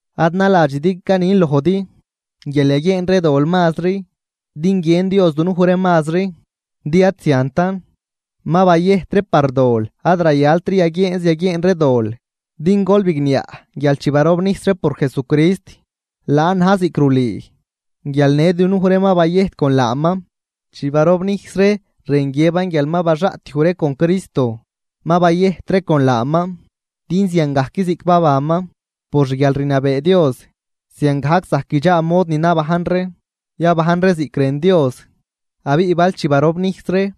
Ad naladxidi canin lojdi guial yaguieen ree dol mazri din guiën Dios dunuj ree mazri. Din ad ziantan, ma bayëjt ree par dol ad rayaltri yaguieenz yaguieen ree dol. Din gol bigniaꞌ guial chi barobnijs ree por Jesucrist, laan na̱j ziꞌc rulüü guial në dunuj ree ma bayëjt con laaman. Chi barobnijs ree rën guiëban guial ma baxaꞌtyuj ree con Cristo, ma bayëjt ree con laaman din ziangajc ziꞌc babanman por xguialrniabee Dios ziangajc zajc guidxaa mod ni nabajn ree, yabajn ree ziꞌc rën Dios. Abiꞌ bal chi barobnijs ree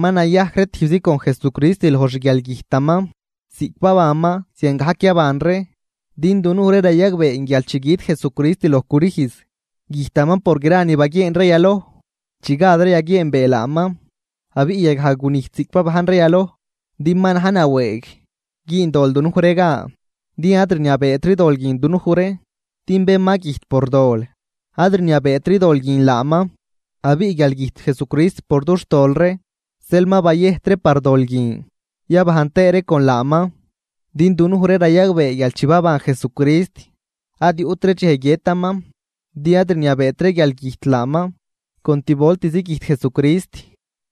ma nayajc ree tijbzi con Jesucrist loj xguialgüjtaman, ziꞌc babanman ziangajc yaban ree. Din dunuj ree rayagbee guial chi güt Jesucrist loj crüjz, güjtaman por gra ni baguieen ree yaloj chi gad ree yaguieenbee laaman, abiꞌ yagaj gunijt ziꞌc babajn ree yaloj, din ma na̱j nawëëg güün dol dunuj ree gan din ad rniabeetri dol guin dunuj ree. Din bén ma güjt por dol, ad rniabeetri dol guin laaman. Abiꞌ guial güjt Jesucrist por dux tol ree, zeel ma bayëjt ree par dol guin, yabajn tëë ree con laaman. Din dunuj ree rayagbee guial chi baban Jesucrist ad yuꞌtri dxej guiëtaman din ad rniabeet guialgüjt laaman. Con tivoltizi güjt Jesucrist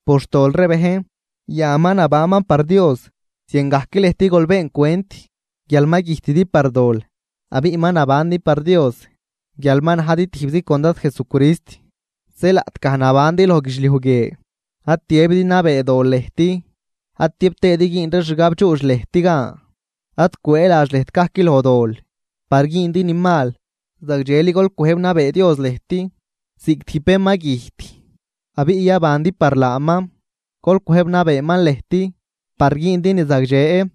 por xtol ree bejn, yan ma nabanman par Dios. Ziangajc lëjt gol been cwent guial ma güjtidi par dol, abiꞌ ma nabandi par Dios guial ma najdi tijbzi con Dad Jesucrist. Zeel laꞌtgaj nabandi loj guidxliuj guie ad tiëbidi nabee dol lëjt, ad tiëb tëëdi güün ree xgabdxuudx lëjt gan. Ad cwëëladx lëjt gajc loj dol par güündi ni mal, zagdxeli gol cwëjb nabee Dios lëjt, ziꞌc tijb bén ma güjt, abiꞌ yabandi par laaman. Gol cwëjb nabeeman lëjt par güündi ni zagdxe.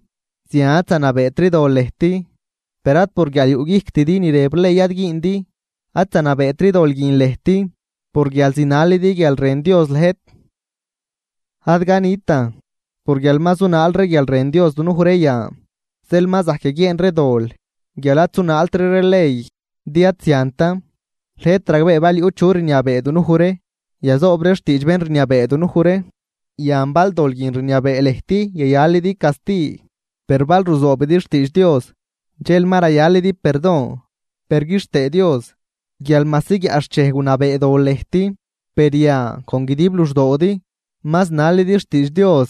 Zian ad zanabeetri dol lëjt, per ad por guial yuꞌguijctidi ni rëb ley ad güündi, ad zanabeetri dol guin lëjt por guial zinalidi guial rën Dios lëjt. Ad canitan por guial ma zunaal ree guial rën Dios dunuj ree yan, zeel ma zajc yaguieen ree dol guial ad zunaaltri ree ley, din ad ziantan. Lëjt ragbee bal yuꞌ chu rniabee dunuj ree, yazoob ree xtiidx bén rniabee dunuj ree. Yan bal dol guin rniabee lëjt yayalidi casti, per bal ruzoobidi xtiidx Dios dxel ma rayalidi perdon. Per quixtëë Dios guial majsi guiaꞌxchej gunabee dol lëjt, per yan con guidib luxdoodi ma zinalidi xtiidx Dios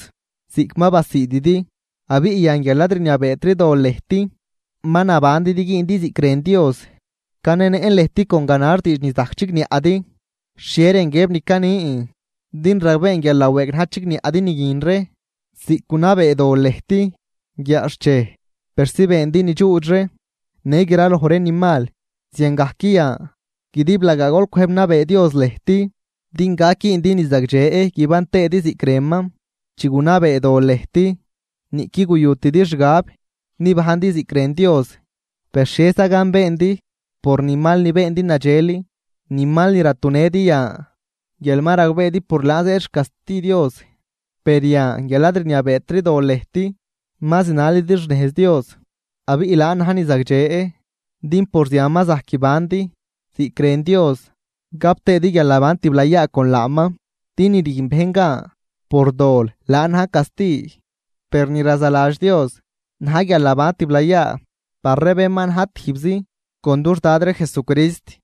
ziꞌc ma basiididi. Abiꞌ yan guial ad rniabeetri dol lëjt, ma nabandi din güündi ziꞌc rën Dios. (Canenëꞌn lëjt con ganax diidx ni zajc chigniaꞌdi xhie rën guiëb ni canin, din ragbeen guial nawëëg na̱j chigniaꞌdi ni guin ree.) Ziꞌc gunabee dol lëjt guiaꞌxchej persi beendi ni dxuudx ree në graloj ree ni mal, ziangajc yan guidiblagaa gol cwëjb nabee Dios lëjt din gac güündi ni zagdxe guiban tëëdi ziꞌc rënman. Chi gunabee dol lëjt niꞌquid guyutidi xgab nibajndi ziꞌc rën Dios. Per, ¿xhieza gan beendi por ni mal ni beendi nadxel, ni mal ni ratunëdi yan guial ma ragbeedi por laan zëëd xcasti Dios? Per yan guial ad rniabeetri dol lëjt ma zinalidi xnejz Dios, abiꞌ laan na̱j ni zagdxe din por zian ma zajc guibandi ziꞌc rën Dios gap tëëdi guialnaban tiblayaa con laaman. Din ni rüjn bejn gan por dol laan na̱j casti, per ni razaladx Dios na̱j guialnaban tiblayaa par ree bén ma na̱j tijbzi con dux Dad ree Jesucrist.